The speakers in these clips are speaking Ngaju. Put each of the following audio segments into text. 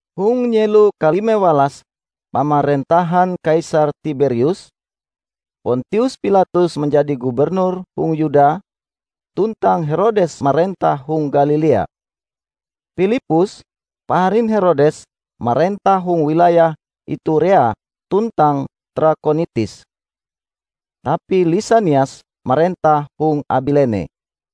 Hong nyelo kalime walas pamarentahan Kaisar Tiberius, Pontius Pilatus manjadi gubernur hong Yuda, tuntang Herodes marentah hong Galilea. Pilippus, paharin Herodes marentah hong wilayah Iturea tuntang Trakonitis, tapi Lisanias marentah hong Abilene.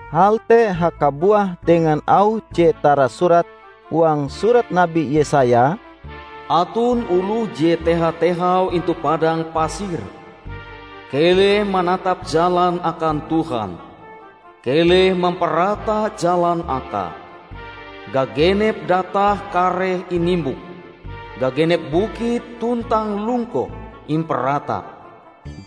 Hal te hakabuah dengan auh je tarasurat huang surat Nabi Yesaya: "Aton oloh je teha-tehau intu padang pasir, 'Keleh manatap jalan akan Tuhan, keleh mamparata jalan akae. Gagenep datah kareh inimbok, gagenep bukit tuntang lungkoh imparata.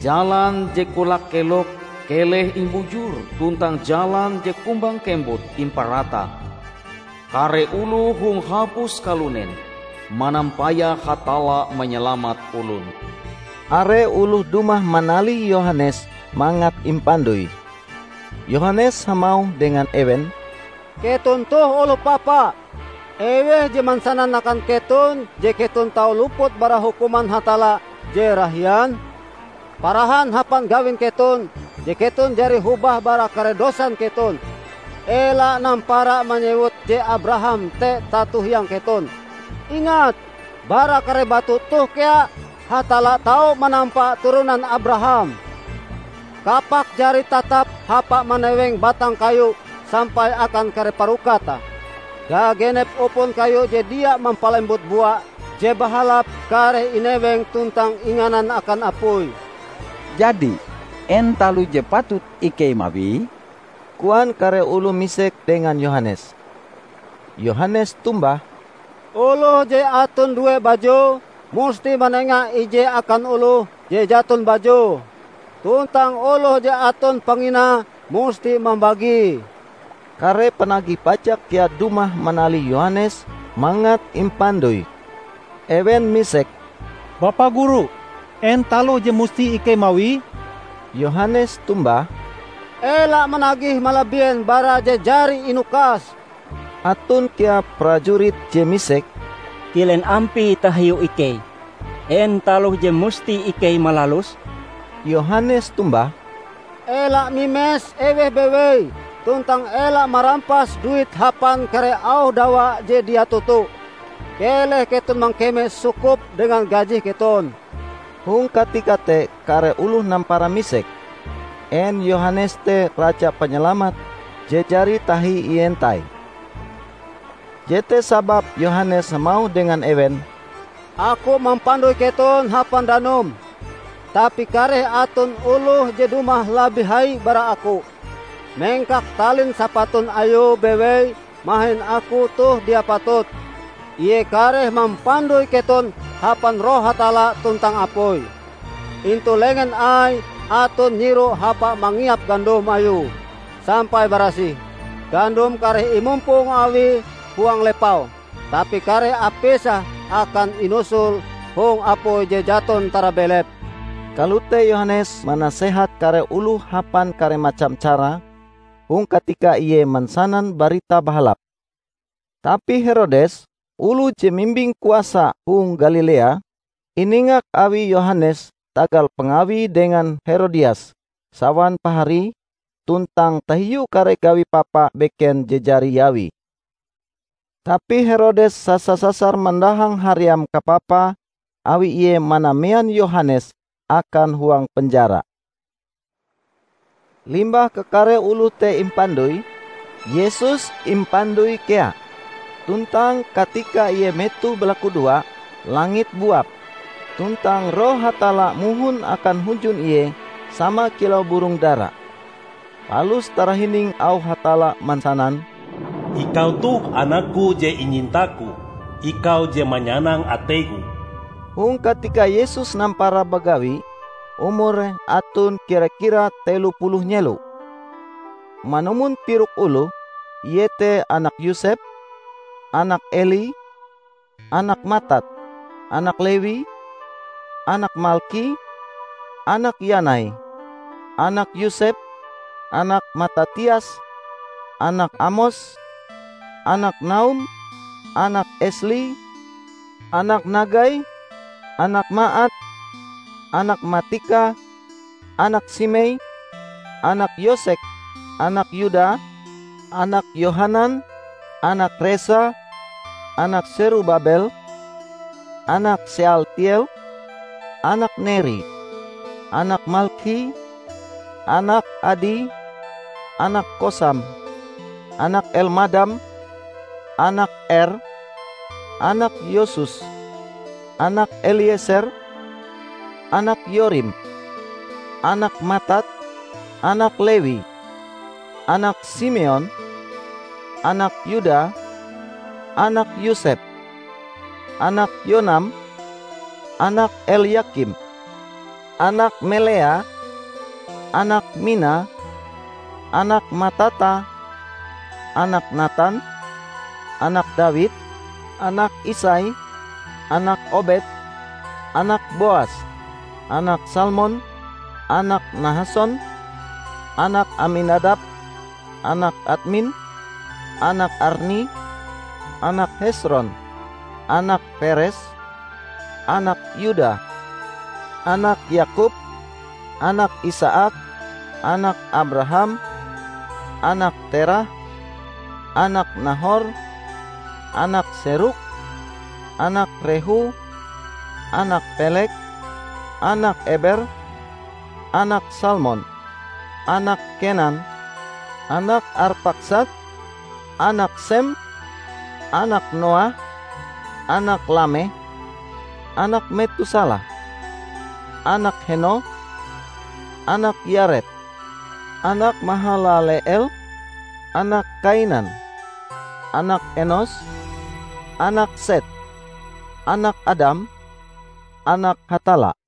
Jalan je kolak-kelok keleh imbujur tuntang jalan je kumbang-kembut imparata. Kare oloh hong hapus kalunen manampayah Hatalla manyalamat olon!' " Are oloh dumah manalih Yohanes mangat impandoi. Yohanes hamauh dengan ewen, "Keton toh oloh papa! Eweh je mansanan akan keton je keton tau luput bara hukuman Hatalla je rahian? Parahan hapan gawin keton je keton jari hobah bara kare dosan keton! Ela nampara manyewut je Abraham te tato-hiang keton. Ingat: Bara kare batu toh kea Hatalla tau manampa turonan Abraham! Kapak jari tatap hapa maneweng batang kayu sampai akan kare parokate. Gagenep upon kayu je dia mampalembut bua je bahalap kareh ineweng tuntang inganan akan apui." "Jadi, en taloh je patut ikei mawie?" koan kare oloh misek dengan Yohanes. Yohanes tombah, "Oloh je aton due bajue, musti manenga ije akan oloh je jaton bajue; tuntang oloh je aton panginae, musti mambagie." Kare panagih pajak kea dumah manalih Yohanes mangat impandoi. Ewen misek, "Bapa Guru, en taloh je musti ikei mawie?" Yohanes tombah, "Ela managih malabien bara je jari inukas." Aton kea prajurit je misek, "Kilen ampie tahiu ikei? En taloh je musti ikei malaluse?" Yohanes tombah, "Ela mimes eweh bewei tuntang ela marampas duit hapan kare auh dawa je dia toto. Keleh keton mangkeme sukup dengan gajih keton!" Hong katika te kare oloh nampara misek, en Yohanes te Raja Panyalamat je jari tahi ientai. Jete sababe Yohanes hamauh dengan ewen, "Aku mampandoi keton hapan danum, tapi kareh aton oloh je dumah labih hai bara aku. Mengkak talin sapatun Ayue bewei mahin aku toh dia patut. Ie kareh mampandoi keton hapan Roh Hatalla tuntang apui. Intu lengen Aie aton nyiru hapa mangiap gandom Ayue sampai barasih. Gandom kareh imumpong Awie huang lepau, tapi kare apise akan inusul hong apui je jaton tarabelep!" Kalote Yohanes manasehat kare oloh hapan kare macam cara, hong katika ie mansanan Barita Bahalap. Tapi Herodes, oloh je mimbing kuasa hong Galilea, iningak awi Yohanes tagal pangawie dengan Herodias, sawan paharie, tuntang tahiu kare gawi papa beken je jari iawie. Tapi Herodes sasa-sasar mandahang haream kapapae awi ie manamean Yohanes akan huang penjara. Limbah kakare oloh te impandoi, Yesus impandoi kea. Tuntang katika Ie metoh balakudoa, langit buap, tuntang Roh Hatalla mohon akan hunjun Ie sama kilau burong dara. Palus tarahining auh Hatalla mansanan, "Ikau toh Anak-Ku je inyinta-Ku. Ikau je manyanang atei-Ku." Hong katika Yesus nampara bagawi, umure aton kira-kira telo puluh nyelo. Manumon tirok oloh, ie te anak Yosep, anak Eli, anak Matat, anak Lewi, anak Malki, anak Yanai, anak Yosep, anak Matatias, anak Amos, anak Naum, anak Esli, anak Nagai, anak Maat, anak Matika, anak Simei, anak Yosek, anak Yuda, anak Yohanan, anak Resa, anak Serubabel, anak Sealtiel, anak Neri, anak Malkhi, anak Adi, anak Kosam, anak Elmadam, anak Er, anak Yosus, anak Elieser, anak Yorim, anak Matat, anak Lewi, anak Simeon, anak Yuda, anak Yosep, anak Yonam, anak Elyakim, anak Melea, anak Mina, anak Matata, anak Natan, anak Dawid, anak Isai, anak Obed, anak Boas, anak Salmon, anak Nahason, anak Aminadab, anak Admin, anak Arni, anak Hesron, anak Peres, anak Yuda, anak Yakob, anak Isaak, anak Abraham, anak Terah, anak Nahor, anak Serug, anak Rehu, anak Peleg, anak Eber, anak Salmon, anak Kenan, anak Arpakhsad, anak Sem, anak Noah, anak Lameh, anak Metusalah, anak Henoh, anak Yared, anak Mahalaleel, anak Kainan, anak Enos, anak Set, anak Adam, anak Hatalla.